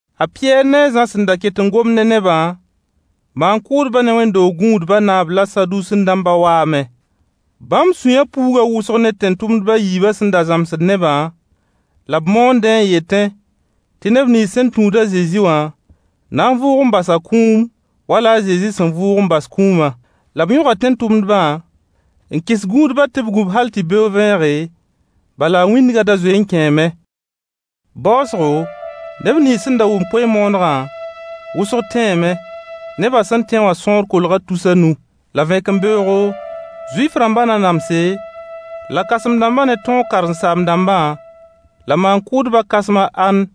A Pɩyɛɛr ne a Zã sẽn da ket n gomd ne nebã, maan-kʋʋdbã ne wẽnd-doog gũudba naab la Saduusẽ-dãmba waame. Bãmb sũyã puuga wʋsg ne tẽn-tʋmdba yiibã sẽn da zãmsd nebã la b moondẽ n yetẽ tɩ neb nins sẽn tũud a Zezi wã na n vʋʋg n bas a kũum wala a Zezi sẽn vʋʋg n bas kũuma. La b yõga tẽn-tʋmdbã n kɩs gũudbã tɩ b gũ-b hal tɩ beoog vẽege, bala wĩndga da zoe n kẽeme. Baoosgo, neb nins sẽn da wʋm koe-moonegã, wʋsg tẽeme. Neba sẽn tẽ wã sõor kolga tus a nu. La vẽkembeoogo, Zuif-rãmba nanamse la kãsem-dãmba ne tõog karen-saam-dãmbã, la maan-kʋʋdbã kãsem a Ãnn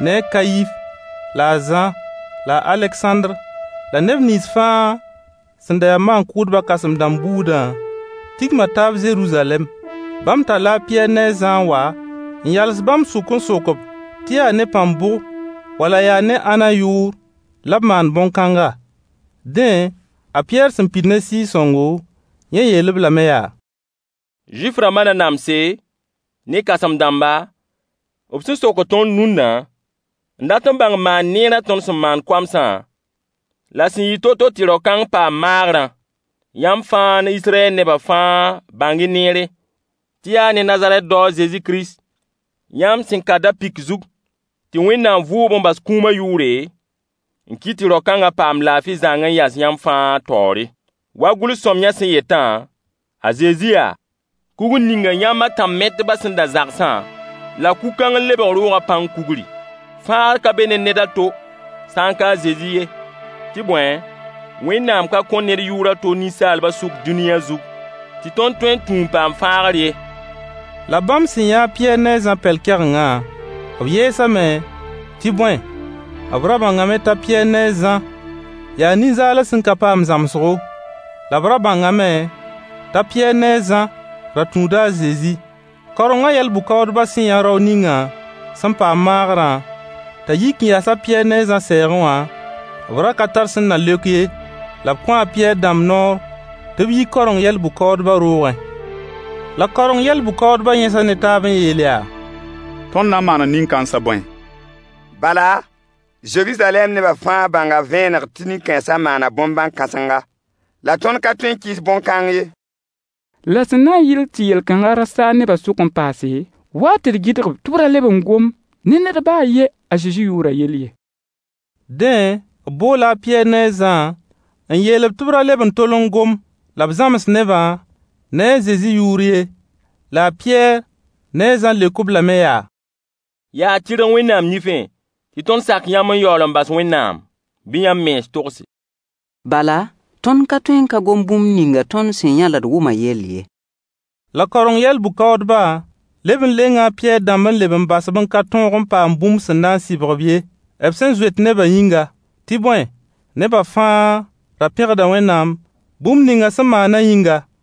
ne a Kayif, la a Zã la a Alegsãndr la neb nins fãa sẽn da ya maan-kʋʋdba kãsem-dãmb buudã tigma taab Zeruzalɛm. Bãmb talla a Pɩyɛɛr ne a Zã n wa n yals bãmb sʋk n sok-b tɩ yaa ne pãng bʋg wala yaa ne ãnna yʋʋr la b maan bõn-kãnga. Dẽ, a Pɩyɛɛr sẽn pid ne Sɩɩg-sõngo, yẽ yeel-b lame yaa: Zuif-rãmba nanamse ne kãsem-dãmba, b sẽn sokd tõnd rũnna n dat bãng maan-neerã tõnd sẽn maan koamsã, la sẽn yɩ to-to tɩ rao-kãng paam maagrã. Yãmb fãa ne Israyɛl neba fãa bãng-y neere, tɩ yaa ne Nazarɛt dao a Zezi Kirist yãmb sẽn ka da-pɩk zug tɩ Wẽnnaam vʋʋg-b n bas kũuma yʋʋre, n kɩt tɩ rao-kãnga paam laafɩ zãng n yas yãmb fãa taoore. Wa gʋls sõamyã sẽn yetã, a Zezi yaa: “Kugr ninga yãmb a tãn-metbã sẽn da zagsã, la kug-kãng n lebg roogã pãng kugri.” Fãagr ka be ne ned a to sã ka a Zezi ye. Tɩ bõe, Wẽnnaam ka kõ ned yʋʋr a to ninsaalba sʋk dũniyã zug tɩ tõnd tõe n tũ m paam fãagr ye. La bãmb sẽn yã a Pɩyɛɛr ne a Zã pɛl-kɛgengã, b yɛɛsame, tɩ bõe, b ra bãngame t'a Pɩyɛɛr ne a Zã yaa nin-zaals sẽn ka paam zãmsgo. La b ra bãngame t'a Pɩyɛɛr ne a Zã ra tũuda a Zezi. Kaorengã yɛl-bʋ-kaoodbã sẽn yã rao ningã sẽn paam maagrã t'a yik n yas a Pɩyɛɛr ne a Zã sɛɛgẽ wã, b ra ka tar sẽn na leok ye. La b kõo a Pɩyɛɛr dãmb noor tɩ b yi kaoreng yɛl-bʋ-kaoodba roogẽ. La kaoreng yɛl-bʋ-kaoodbã yẽsa ne taab n yeel yaa: Tõnd na n maana nin-kãensa bõe? Bala, Zeruzalɛm neba fãa bãnga vẽeneg tɩ nin-kãensa maana bõn-bãn-kãsenga, la tõnd ka tõe n kɩɩs bõn-kãng ye. La sẽn na n yɩl tɩ yel-kãnga ra saag neba sʋk n paase, wa-y tɩ d gɩdg-b tɩ b ra leb n gom ne ned ba a yen a Zezi yʋʋrã yell ye. Dẽ, b boola a Pɩyɛɛr ne a Zã n yeel-b tɩ b ra leb n tol n gom la b zãms nebã ne a Zezi yʋʋr ye. La a Pɩyɛɛr ne a Zã leok-b lame yaa: Yaa tɩrg Wẽnnaam nifẽ tɩ tõnd sak yãmb n yaool n bas Wẽnnaam? Bɩ yãmb mens togse. Bala, tõnd ka tõe n ka gom bũmb ninga tõnd sẽn yã la d wʋma yell ye. La kaoreng yɛl-bʋ-kaoodba leb n lenga a Pɩyɛɛr dãmb n leb n bas-b n ka tõog n paam bũmb sẽn na n sɩbg-b ye, b sẽn zoet nebã yĩnga. Tɩ bõe, neba fãa ra pẽgda Wẽnnaam bũmb ninga sẽn maana yĩnga.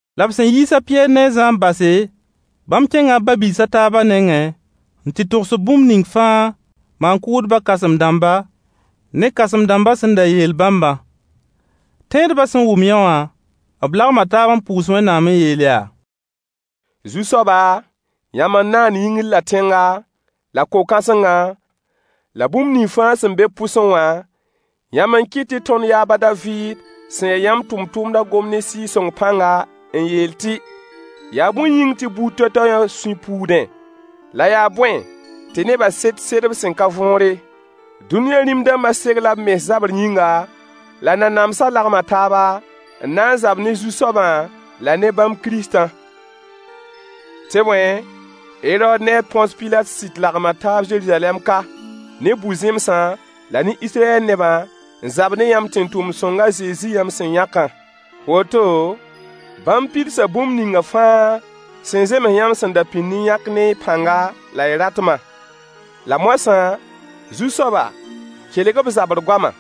La b sẽn yiis a Pɩyɛɛr ne a Zã n base, bãmb kẽnga b ba-biis a taaba nengẽ, n tɩ togs-b bũmb ning fãa maan-kʋʋdba kãsem-dãmba ne kãsem-dãmba sẽn da yeel bãmbã. Tẽedba sẽn wʋm yõwã, b lagma taab n pʋʋs Wẽnnaam n yeel yaa: Zu-soaba, yãmb n naan yĩngr la tẽnga, la ko-kãsengã, la bũmb nins fãa sẽn be b pʋsẽ wã, yãmb n kɩt tɩ tõnd yaab a Daviid sẽn ya yãmb tʋmtʋmda gom ne Sɩɩg-sõng pãnga, n yeel tɩ: “Yaa bõe yĩng tɩ buud toay-toayã sũy puudẽ, la yaa bõe tɩ nebã set sedb sẽn ka võore. Dũniyã rĩm-dãmba segla b mens zabr yĩnga, la nanamsã lagma taaba, n na n zab ne Zu-soabã la ne bãmb Kiristã.” Tɩ bõe, Herood ne a Põns Pilat sɩd lagma taab Zeruzalɛm ka, ne bʋ-zẽmsã la ne Israyɛl nebã n zab ne yãmb tẽn-tʋmd-sõng a Zezi yãmb sẽn yãkã. Woto, bãmb pidsa bũmb ninga fãa sẽn zems yãmb sẽn da pĩnd n yãk ne y pãnga la y ratma. La moasã, Zu-soaba, kelg-y b zabr goama.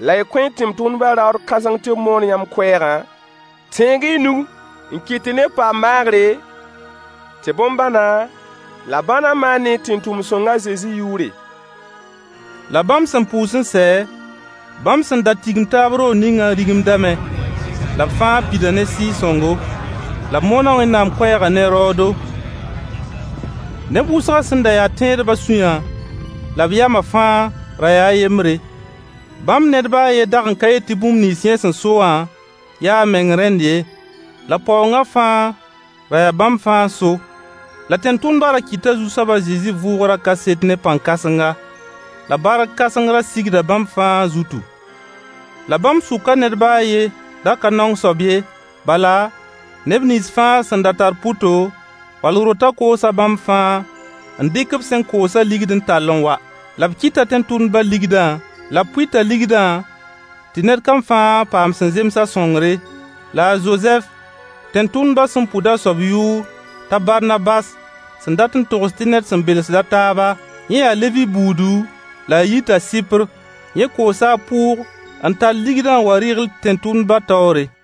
La y kõ y tẽn-tʋmdbã raood kãseng tɩ b moon yãmb koɛɛgã. Tẽeg-y y nug n kɩt tɩ neb paam maagre, tɩ bõn-bãna la bãna maan ne y tẽn-tʋmd-sõng a Zezi yʋʋre. La bãmb sẽn pʋʋs n sɛ, bãmb sẽn da tigim taab roog ningã rigmdame. La b fãa pida ne Sɩɩg-sõngo. La b moona Wẽnnaam koɛɛgã ne raoodo. Neb wʋsgã sẽn ya tẽedbã sũyã la b yama fãa ra yaa a yembre. Bãmb ned ba a yen dag n ka yet tɩ bũmb nins yẽ sẽn so wã yaa a meng rẽnd ye. La paoongã fãa ra yaa bãmb fãa n so. La tẽn-tʋmdbã ra kɩta Zu-soaba a Zezi vʋʋgrã kaset ne pãn-kãsenga. La bark kãseng ra sigda bãmb fãa zutu. La bãmb sʋka ned ba a yen da ka naong soab ye, bala, neb nins fãa sẽn da tar pʋto, wall rotã koosa bãmb fãa, n dɩk b sẽn koosã ligd n tall n wa. La b kɩta tẽn-tʋmdba ligdã, la b pʋɩta ligdã tɩ ned kam fãa paam sẽn zems a sõngre. La a Zozɛf, tẽn-tʋmdbã sẽn pʋd a soab yʋʋr t'a Barnabas sẽn dat n togs tɩ ned sẽn belsd a taaba. Yẽ yaa Levi buudu la a yita Sɩpr. Yẽ koosa a pʋʋg n tall ligdã n wa rɩgl tẽn-tʋmdba taoore.